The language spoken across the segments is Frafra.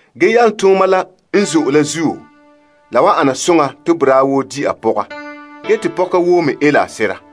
Ge yalomtooma la n zo'e la zuo, la wan ana soŋa te boraa woo di a pɔga, ge te pɔka woo me ele a sera.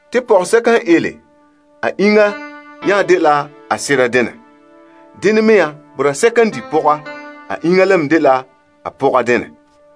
Pɔka la iŋa nya dela a sera denɛ, te sera iŋa mɛ dɛna pɔka la denɛ.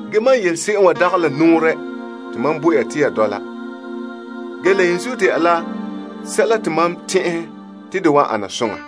Mam yele ya se'em wa dagɛ la nɔɔrɛ te mam bo ya te ya dɔla, ge la yenzuo dɛna la sɛla te mam tɛn'ɛhɛ te de wan ana soŋa.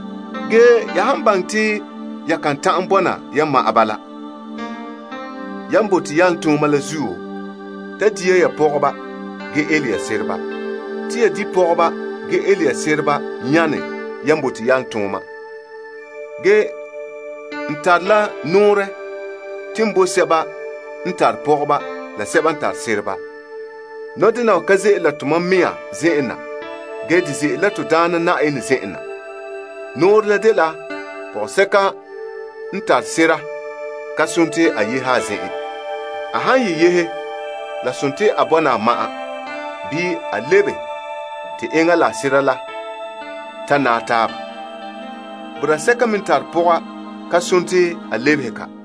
Ge ya han baŋɛ te ya kan ta'an bɔna ya ma'an bala, yan bote yalomtooma la zuo, ta di ya ya pɔgɔba, ge ele ya sereba. Te yan di pɔgɔba, ge ele sereba nyane yan bote yalomtooma. Ge n tare la nɔɔrɛ te n bo sɛba n tare pɔgɔba la sɛba n tare sereba. Nɔdena wa ka ze'ele la mam zen'an na, ge de ze'ele la Na'ayenɛ zen'en na. Nɔɔrɛ la dela pɔka n tare sera ka nare a yehe a zen'en. A han ye yehe, la dela a bɔna a ma'an bii, a lebe te enŋa la a sera le ta naɛ taaba. Boraa n tara pɔga ka nare te a lebehe ka.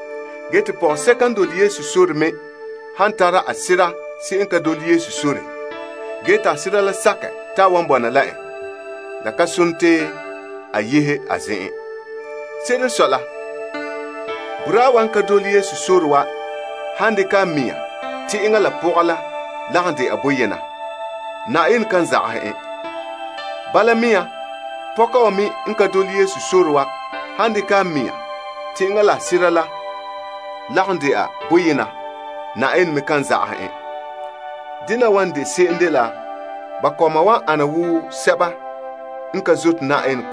Ge te pɔgɔsɛka n dole Yesu sore me han tara a sera se'em n ka dole Yesu sore, ge te a sera la sakɛ te a wan bɔna la en, la ka nare te a yehe a zen'en. Se'ere n sɔe la, boraa la n ka dole Yesu sore la han dekɛ a mɛŋa naɛ la a pɔga la, Na'ayenɛ to'ore boraa la mɛ. Pɔka wa me n ka dole Yesu sore la han dekɛ a mɛŋa naɛ la a sera la, Na'ayenɛ to'ore pɔka la mɛ. La han eŋɛ bala, Na'ayenɛ to'ore ba kɔma la mɛ. Ge la han dagɛ ne bala, ba kɔma wan dene la sɛba n ka zote Na'ayenɛ.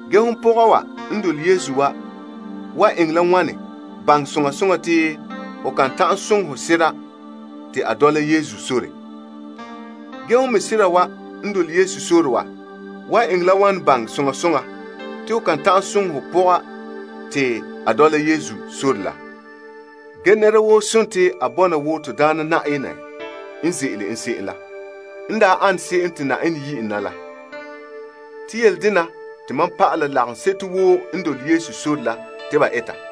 Ge hon pɔga wa n dole Yesu wa wan eŋɛ la wane baŋɛ soŋa soŋa te ho kan ta'an soŋɛ ho sera te a dɔla Yesu sore? Ge hon me sera wa n dole Yesu sore wa wan eŋɛ la wane baŋɛ soŋa soŋa te ho kan ta'an soŋɛ ho pɔga te a dɔla Yesu sore la? Nɛra woo dela a bɔna wo Na'ayenɛ n yi en na, ge ze'ele en se'em la. Yele dena te mam pa'ala lagaŋseto woo n dole Yesu sore la te ba eta.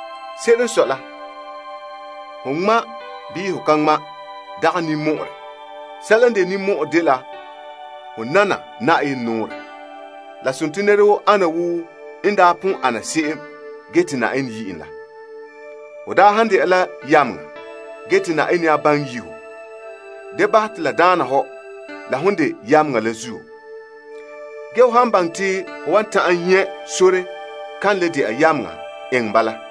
Se'ere n sɔe la, ho ŋma ya wooo ho ka ŋma' wooo dagɛ ninmɔ'ɔrɛ. Sɛla n de ninmɔ'ɔrɛ dela ho nana Na'ayenɛ nɔɔrɛ. Yele ana wa poan nɛra woo ana wo n daa pon ana se'em, ge te Na'ayenɛ yi' en la. Ho daa han dɛna la yameŋa, ge te Na'ayenɛ nya baŋɛ yi' ho, da bahɛ te la daana hɔ la hon de yameŋa la zuo. Ge ho han baŋɛ te ho wan ta'an nyɛ' sore kan le dɛna yameŋa, eŋɛ bala.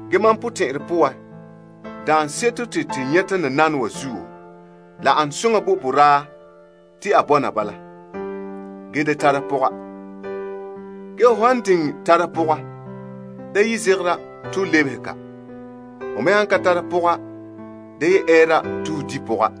Ge mam potɛn'ɛrɛ poan daanseto te to nyɛta nananawa zuo, la ane soŋa te boraa la bɔna bala. Ge ho han diŋɛ tara pɔga, da zegera te ho lebehe ka. Ho me han ka tara pɔga, da ɛɛra te ho di pɔga.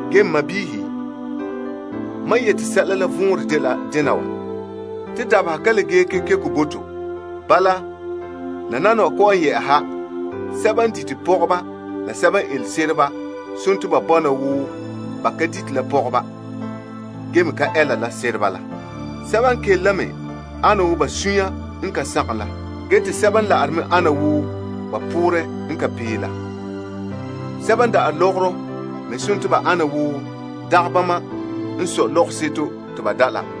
Ge n sɔɔnrɔ, mam yeti sɛla la vɔnrɛ dela, dabeha la ka le gee zo'e bo to. Bala, sɛba n tare sereba la pɔgɔba bɔna wo ba ka tare mɛ la. Sɛba n kele ana wo ba sunya n ka sagom la, ge te sɛba n la'are ana wo ba poorɛ n ka pee la. Sɛba n da'are lɔgɔrɔ me ana wo dagɛ bama n sɔe lɔgɔrɔ la.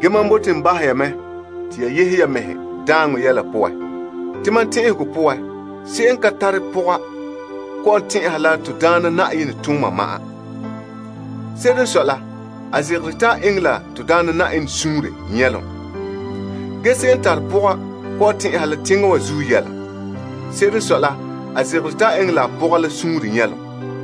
Mam bote n yehe ya la daaŋɔ yɛla poan. Se'em n ka tare pɔga kɔ'ɔn tɛn'ɛha la Na'ayenɛ tooma ma'an, ge zegera te a eŋɛ la Na'ayenɛ suunre nyɛlom. Ge se'em n tare pɔga kɔ'ɔn tɛn'ɛha la teŋa wa zuo yɛla. Se'ere n sɔe la, a zegere te a eŋɛ la a pɔga la suunre nyɛlom.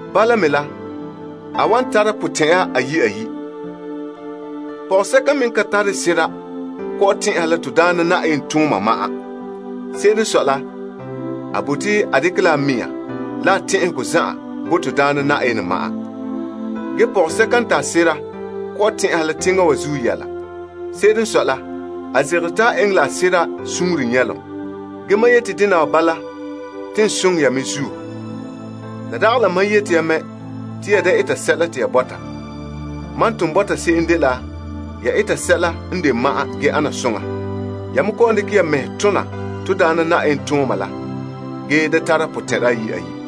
Bala me la, a wan tara potɛn'ɛra ayi' ayi'. Pɔgɔsɛka me n ka tare sera kɔ'ɔn tɛn'ɛha la Na'ayenɛ tooma ma'an. Se'ere n sɔe la, a bote a dekɛ la a mɛŋa la a tɛn'ɛhegɔ zan'an bo Na'ayenɛ ma'an. Ge pɔgɔsɛka n tare sera kɔ'ɔn tɛn'ɛha la teŋa wa zuo yɛla. Se'ere n sɔe la, a zegere te a eŋɛ la a sera suunre nyɛlom. Ge mam yete dena wa bala te n soŋɛ ya mɛ zuo. La dagɛ la mam yete ya mɛ te ya da eta sɛla te ya bɔta. Mam n ton bɔta se'em dela ya eta sɛla n de ma'an ge ana soŋa. Ya me kɔ'ɔn dekɛ ya mɛhe tona Na'ayenɛ tooma la ge da tara potɛn'ɛra ayi' ayi'.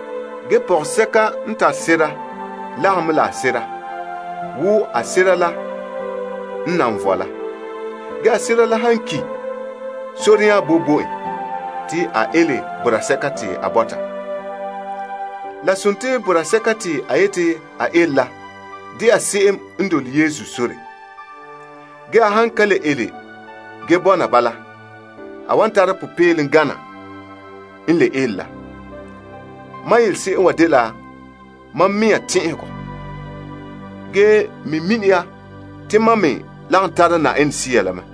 Ge pɔgɔsɛka n tare sera lagom mɛ la a sera wo a sera la n nan vɔe la. Ge a sera la han ki, sore nya boe bo en te a ele boraa sɛka te a bɔta. Ge boraa sɛka te a wan ele la dɛna se'em n dole Yesu sore. Ge a han ka le ele ge bɔna bala, a wan tara popeelom gana n le ele la. Mam yele se'em wa dela mam mɛŋa tɛn'ɛhegɔ ge me mini ya te mam me lagom tara Yenɛ Sea la mɛ.